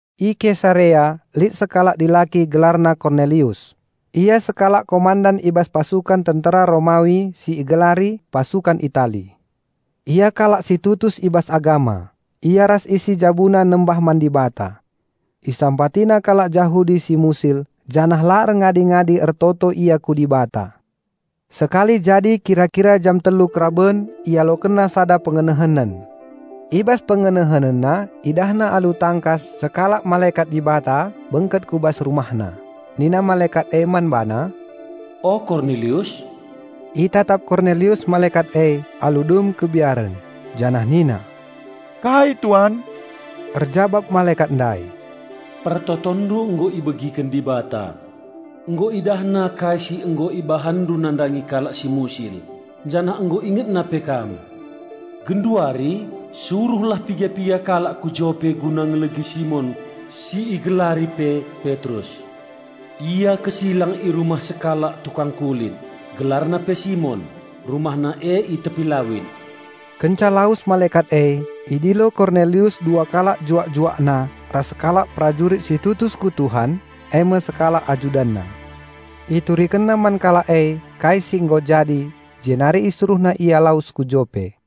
I Kesarea lit sekalak dilaki gelarna Kornelius. Ia sekalak komandan i bas pasukan tentera Romawi si igelari "Pasukan Itali". Ia kalak si tutus i bas agama; ia ras isi jabuna nembah man Dibata. Isampatina kalak Jahudi si musil janah la erngadi-ngadi ertoto ia ku Dibata. Sekali jadi kira-kira jam telu karaben ialokenna sada pengenehenen. I bas pengenehenenna idahna alu tangkas sekalak malekat Dibata bengket ku bas rumahna. Nina malekat e man bana, "O Kornelius." Itatap Kornelius malekat e alu dem kebiaren, janah nina, "Kai Tuan?" Erjabap malekat ndai, "Pertotonndu nggo ibegiken Dibata. Nggo IdahNa kai si nggo ibahanndu nandangi kalak si musil, janah nggo IngetNa pe kam. Genduari, suruhlah piga-piga kalak ku Jope guna ngelegi Simon si igelari pe Petrus. Ia kesilang i rumah sekalak tukang kulit, gelarna pe Simon. Rumahna e i tepi lawit." Kenca lawes malekat e, idilo Kornelius dua kalak juak-juakna ras sekalak perajurit si tutus ku Tuhan eme sekalak ajudanna. Iturikenna man kalak e kai si nggo jadi, jenari isuruhna ia lawes ku Jope.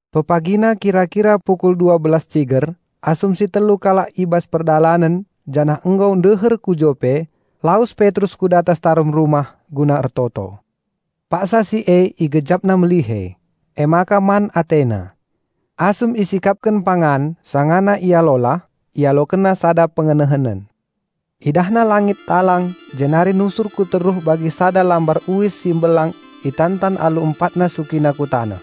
Pepagina kira-kira pukul dua belas ciger, asum si telu kalak e i bas perdalanen janah nggo ndeher ku Jope, lawes Petrus ku datas tarum rumah guna ertoto. Paksa si e igejapna melihe, emaka man atena. Asum isikapken pangan, sangana ia lolah, ialokenna sada pengenehenen. Idahna langit talang jenari nusur ku teruh bagi sada lambar uis si mbelang itantan alu empatna sukina ku taneh.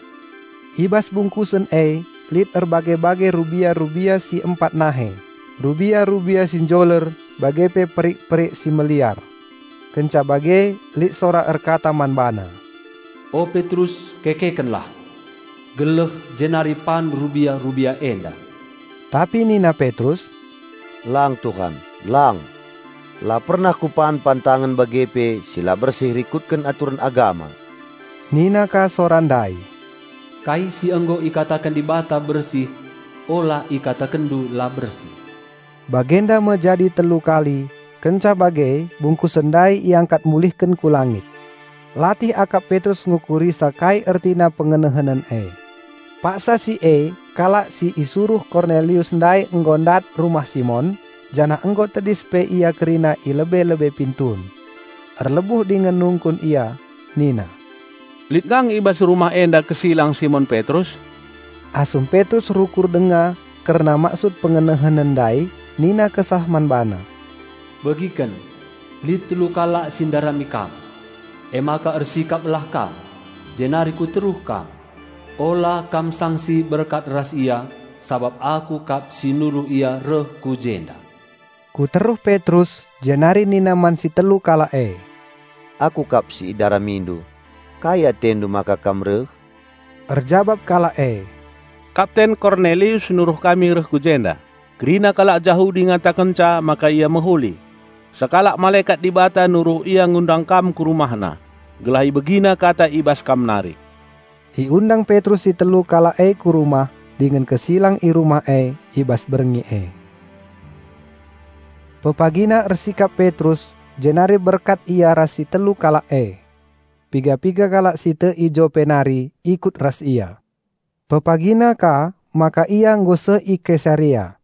I bas bungkusen e lit erbage-bage rubia-rubia si empat nahe, rubia-rubia si njoler bage pe perik-perik si meliar. Kenca bage lit sora erkata man bana, "O Petrus, kekekenlah, geleh jenari pan rubia-rubia enda." Tapi nina Petrus, "Lang Tuhan, lang! La pernah kupan pantangen bage pe si la bersih rikutken aturen agama." Nina ka sora ndai, "Kai si nggo ikataken Dibata bersih ula ikatakenndu la bersih." Bagenda me jadi telu kali, kenca bage bungkusen ndai iangkat mulihken ku langit. Latih akap Petrus ngukurisa kai ertina pengenehenen e. Paksa si e kalak si isuruh Kornelius ndai nggo ndat rumah Simon, janah nggo tedis pe ia kerina i lebe-lebe pintun. Erlebuh dingen nungkun ia nina, "Lit kang i bas rumah enda kesilang Simon Petrus?" Asum Petrus rukur denga kerna maksud pengenehenen ndai, nina Kesah man bana, "Begiken! Lit telu kalak si ndarami kam. Emaka ersikaplah kam, jenari ku teruh kam. Ula kam sangsi berkat ras ia sabap Aku kap si nuruh ia reh ku jenda." Ku teruh Petrus jenari nina man si telu kalak e, "Aku kap si idaramindu. Kai atendu maka kam reh?" Erjabap kalak e, "Kapten Kornelius nuruh kami reh ku jenda. Kerina kalak Jahudi ngatakenca maka ia mehuli. Sekalak malekat Dibata nuruh ia ngundang kam ku rumahna, gelah ibegina kata i bas kam nari." Iundang Petrus si telu kalak e ku rumah dingen kesilang i rumah e i bas berngi e. Pepagina ersikap Petrus jenari berkat ia ras si telu kalak e. Piga-piga kalak si tek i Jope nari ikut ras ia. Pepagina ka maka ia nggo seh i Kesarea.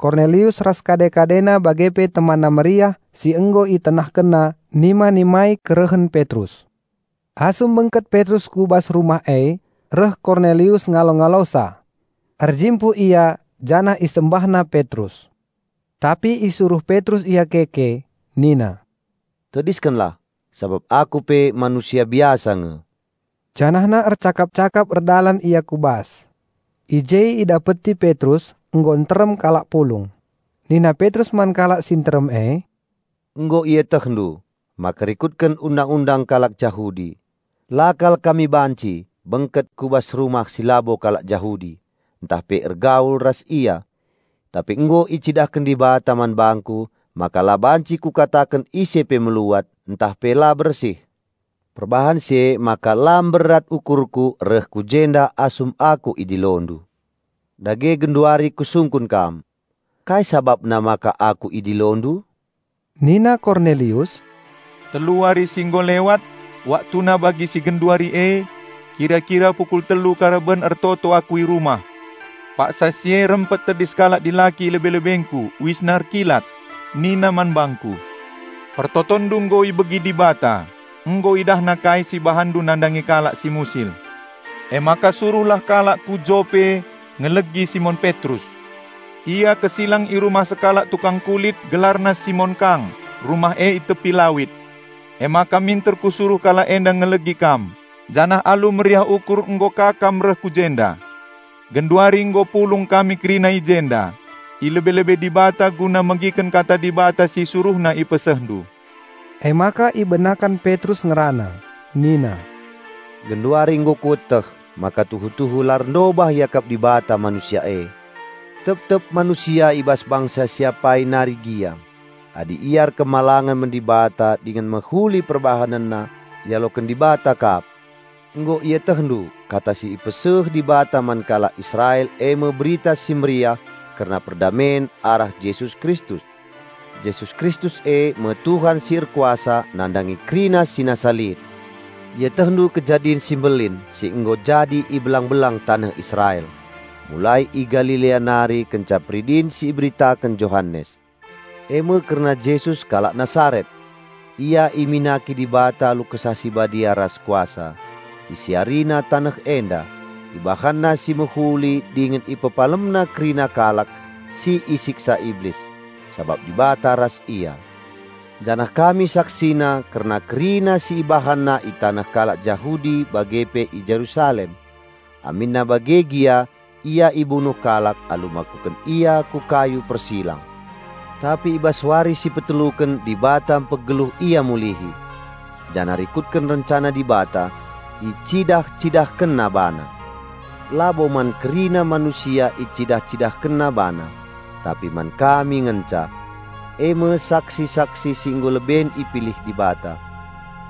Kornelius ras kade-kadena bage pe temanna meriah si nggo itenahkenna nima-nimai kerehen Petrus. Asum bengket Petrus ku bas rumah e, reh Kornelius ngalo-ngalosa. Erjimpuh ia janah isembahna Petrus. Tapi isuruh Petrus ia keke nina, "Tediskenlah, sabap aku pe manusia biasa nge." Janahna ercakap-cakap erdalan ia ku bas. I je idapeti Petrus nggo nterem kalak pulung. Nina Petrus man kalak si nterem e, "Nggo ietehndu maka rikutken Undang-undang kalak Jahudi, la kal kami banci bengket ku bas rumah si labo kalak Jahudi, ntah pe ergaul ras ia. Tapi nggo icidahken Dibata man bangku maka la banci kukataken ise pe meluat ntah pe la bersih. Perbahan si emaka la mberat ukurku reh ku jenda asum aku idilondu. Dage genduari kusungkun kam: Kai sabapna maka aku idilondu?" Nina Kornelius, "Telu wari si nggo lewat, waktuna bagi si genduari e, kira-kira pukul telu karaben ertoto aku i rumah. Paksa si e rempet tedis sekalak dilaki i lebe-lebengku; uisna erkilat. Nina man bangku, 'Pertotonndu nggo ibegi Dibata. Nggo IdahNa kai si ibahanndu nandangi kalak si musil. Emaka suruhlah kalak ku Jope ngelegi Simon Petrus. Ia kesilang i rumah sekalak tukang kulit, gelarna Simon kang. Rumah e i tepi lawit.' Emaka minter kusuruh kalak enda ngelegi kam, janah alu meriah ukur nggo ka kam reh ku jenda. Genduari nggo pulung kami kerina i jenda, i lebe-lebe Dibata guna megiken kata Dibata si IsuruhNa ipesehndu." Emaka ibenaken Petrus ngerana nina, "Genduari nggo kueteh maka tuhu-tuhu la erndobah iakap Dibata manusia e. Tep-tep manusia i bas bangsa si apai nari gia, adi ia erkemalangen man Dibata dingen mehuli perbahanenna, ialoken Dibata kap. Nggo ietehndu kata si ipeseh Dibata man kalak Israel eme Berita Si Mehuli kerna perdamen arah Jesus Kristus. Jesus Kristus eme Tuhan si erkuasa nandangi kerina si nasa lit. Ietehndu kejadin si mbelin si nggo jadi i belang-belang taneh Israel, mulai i Galilea nari kenca peridin si iberitaken Johanes, eme kerna Jesus kalak Nasaret. Ia iminaki Dibata alu Kesah Si Badia ras kuasa. IsiariNa taneh enda, IbahanNa si mehuli dingen IpepalemNa kerina kalak si isiksa Iblis, sabap Dibata ras Ia. Janah kami saksina kerna kerina si IbahanNa i taneh kalak Jahudi bage pe i Jerusalem. Aminna bage gia Ia ibunuh kalak alu makuken Ia ku kayu persilang. Tapi i bas wari si peteluken Dibata mpegeluh Ia mulihi. Janah rikutken rencana Dibata, icidah-CidahkenNa BaNa. Labo man kerina manusia icidah-CidahkenNa BaNa, tapi man kami ngenca; eme saksi-saksi si nggo leben ipilih Dibata.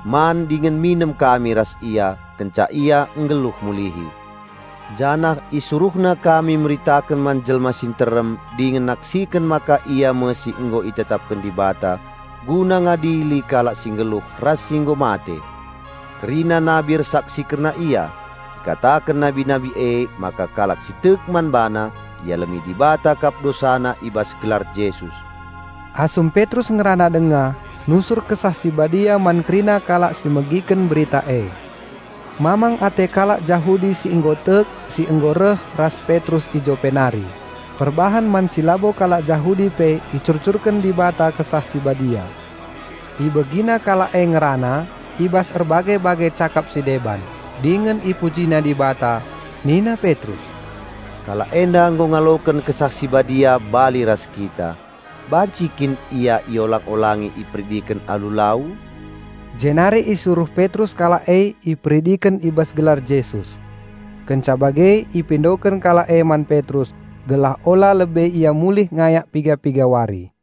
Man dingen minem kami ras Ia kenca Ia nggeluh mulihi. Janah IsuruhNa kami meritaken man jelma si nterem dingen naksiken maka Ia me si nggo itetapken Dibata guna ngadili kalak si nggeluh ras si nggo mate. Kerina nabi ersaksi kerna Ia. Ikataken nabi-nabi emaka kalak si tek man BaNa ialemi Dibata kap dosana i bas gelar Jesus." Asum Petrus ngerana denga, nusur Kesah Si Badia man kerina kalak si megiken Berita e. Mamang ate kalak Jahudi si nggo tek, si nggo reh ras Petrus i Jope nari, perbahan man si labo kalak Jahudi pe icurcurken Dibata Kesah Si Badia. Ibegina kalak e ngerana i bas erbage-bage cakap si deban, dingen ipujina Dibata. Nina Petrus, "Kalak enda nggo ngaloken Kesah Si Badia bali ras kita. Banci kin ia iolang-olangi iperidiken alu lau?" Jenari isuruh Petrus kalak e iperidiken i bas gelar Jesus. Kenca bage ipindoken kalak e man Petrus gelah ula lebe ia mulih ngayak piga-piga wari.